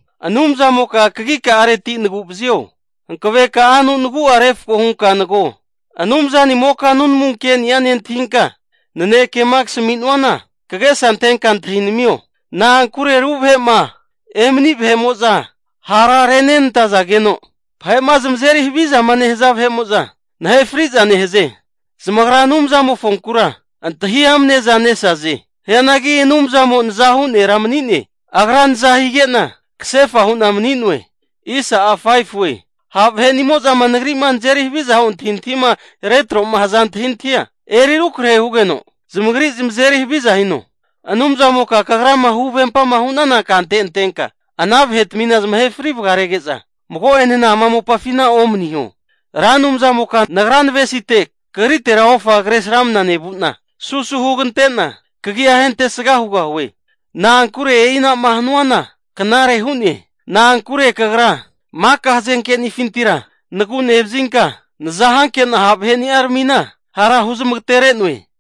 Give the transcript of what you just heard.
Anumzamoka kagika'areti nagu'vazio. Hankanaveka'anu nagu'a refko hunka nago. Anumzanimoka nunamu keni'a nentahinka, nanekema kasami'nuana kagesa antenka antahio. Na'ankure ru vahe'ma emani vahe'mo'za hara renantazageno, vahe'ma zamazeri havizama nehaza vahe'mo'za nahefri'za nehaze. Zamagra Anumzamofonkura antahi amaneza nesaze. Hianagi Anumzamo nazahu nera mani'ne. Agra naza hige'na kasefa hu'na mani'noe. Ha' vahe'nimo'zama nagri'ma nazeri haviza hu antahintahima retro'ma haza antahintahia, eri arukrahe hugeno, zamagri zamazeri haviza hino. Anumzamoka kagrama huvempama hunana kante antenka, ana vahetmina zamahe fri vagarege'za mago'enena ama mopafina omaniho. Ra Anumzamoka nagra navesite kagritera ofa kresramna nevu'na, susu hugante'na kagia ahentesga hugahue. Na'ankure e'inama hanuana knare hu'ne! Na'ankure kagra maka hazenkenifintira nagu nevazinka, nazahanke'na ha' vahe'ni'aramina hara huzmagatere'noe.